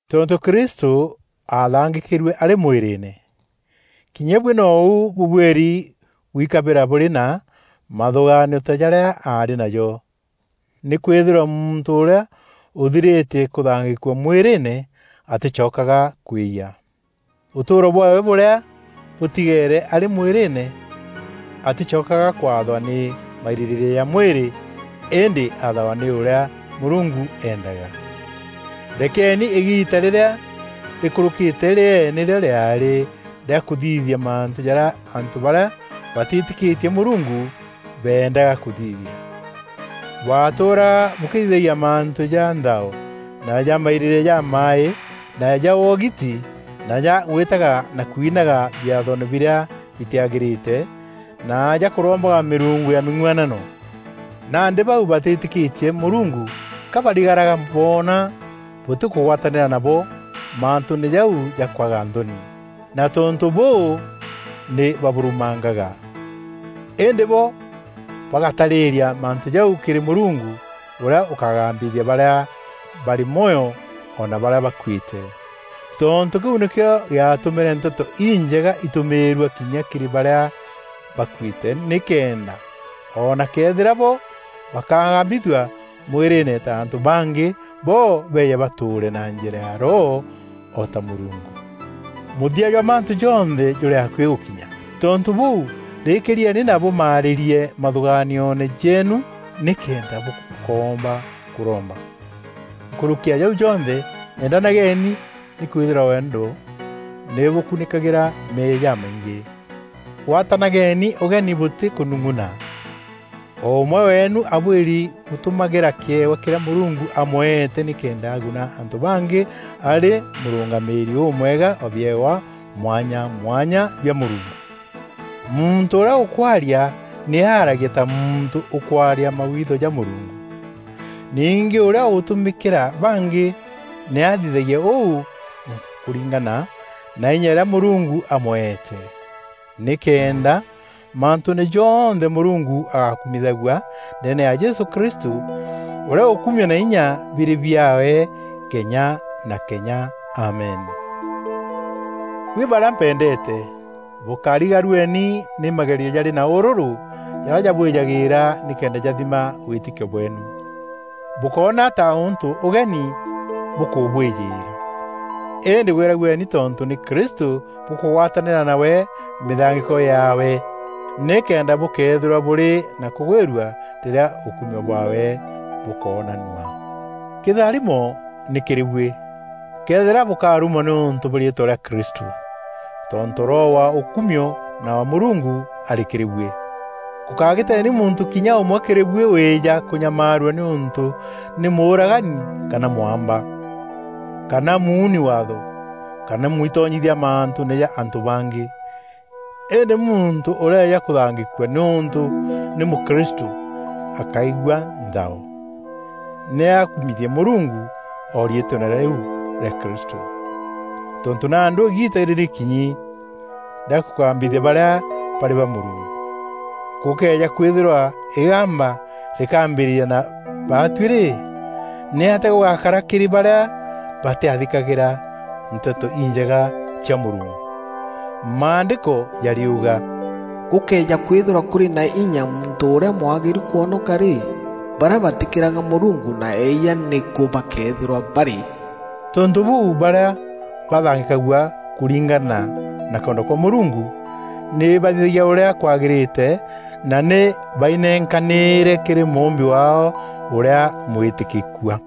Tontû Kristû aathangîkîrue arî mwîrîîne, kinya buî nou bûbuîri gwikabîra bûrî na mathûgaanio ta jarîa aarî najo. Nîkwîthîrwa muntû ûrîa ûthirîtie kûthangîkua mwîrîîne, atîcokaga kwîyia. Ûtûûro bwaawe bûrîa bûtigeere arî mwîrîîne, atîcokaga kwathwa nî mairîrîîria ja mwîrî, îndî athagwa nî ûrîa Mûrungu endaga. Rekeni îgiita rîrîa rîkûrûkîte rîee nîrîo rîaarî rîa kûthithia mantû jarîa antû barîa batîtîkîtie Mûrungu beendaga kûthithia. Bwatûûraga bûkîthithagia mantû ja nthao na ja mairîrîîria jamaaî na ja wogiti na ja gwîtaga na kwinaga biathoone birîa bitîagîrîte na ja kûrombaga mîrungu ya mîng'uanano. Nandî bau batîtîkîtie Mûrungu ka barigaraga boona bûtîkûgwatanîra nabo mantûûne jau ja kwaga nthoni, na tontû bûû nî babûrumangaga. Îndî bo bagataarîîria mantû jau kîrî Mûrungu ûrîa ûkagambithia barîa barî mwoyo o na barîa bakuîte. Tontû kîu nîkîo gîatûmîre Nteto Injega itûmîîrua kinya kîrî barîa bakuîte, nîkenda o na këethîra bo bakagambithua mwîrîîne ta antû bangî, bo beeje batûûre na njîra ya roho o ta Mûrungu. Mûthia jwa mantû jonthe jûrî akuî gûkinya. Tontû bûû, rîkîîrieni na bûmaarîrie mathûgaanioone jeenu nîkenda bûkoomba kûromba. Nkûrûki ya jau jonthe endanageni, nîkwîthîrwa wendo nî bûkunîkagîra meeyia jamaingî. Gwatanageni ûgeni bûtî kûnung'una. O ûmwe weenu abuîri gûtumagîra kîewa kîrîa Mûrungu amweete nîkenda aguna antû bangî arî mûrûngamîîri ûmwega wa biewa mwanya mwanya bia Mûrungu. Muntû ûrîa ûkwaaria, nî aaragie ta muntû ûkwaria mawitho ja Mûrungu. Ningî ûrîa ûgûtumîkîra bangî, nî athithagie ûu kûringana na inya îrîa Mûrungu amweete. Nîkenda mantûûne jonthe Mûrungu agakumithagua ndeene ya Jesû Kristû ûrîa ûkumio na inya birî biaawe kenya na kenya Amen. Buî barîa mpendeete, bûkarigarueni nî magerio jarî na ûrûrû jarîa jabwîjagîîra nîkenda jathima wîtîkio bweenu. Bûkóna ta ûntû ûgeni bûkûbwîjîîra. Îndî gwîragueni tontû nî Kristû bûkûgwatanîra nawe mîthangîko yaawe, nîkenda bûkeethîrwa bûrî na kûgwîrua rîrîa ûkumio bwaawe bûkoonanua. Kîtharimo nî kîrî buî, këethîra bûkarumwa nîûntû bwa riîtwa rîa Kristû, tontû Roho wa ûkumio na wa Mûrungu arî kîrî buî. Gûkagîteni muntû kinya ûmwe kîrî buî wîja kûnyamaarua nîûntû nî mûûragani kana mwamba, kana muuni waatho kana mwitonyithia mantûûne ja antû bangî. Îndî muntû ûrëeja kûthangîkua nîûntû nî mûkristû, akaigua nthao. Nî akumithie Mûrungu o riîtweene rîu rîa Kristû. Tontû nandî îgiita nî rîkinyi rîa kûgambithia barîa barî ba Mûrungu. Gûkëeja kwîthîrwa îgamba rîkambîrîria na baatuî rî, nîatîa gûgakara kîrî barîa batîathîkagîra Nteto Injega cia Mûrungu? Maandîko jariuga, “Gûkëeja kwîthîrwa kûrî na inya muntû ûrîa mwagîru kûonoka rî, barîa batîkîraga Mûrungu na eeyia nîkû bakeethîrwa barî?” Tontû bûû, barîa bathangîkagua kûringana na kwenda kwa Mûrungu nî bathithagia ûrîa kwagîrîte na nî bainenkanîîre kîrî Mûûmbi waao ûrîa mwîtîkîkua.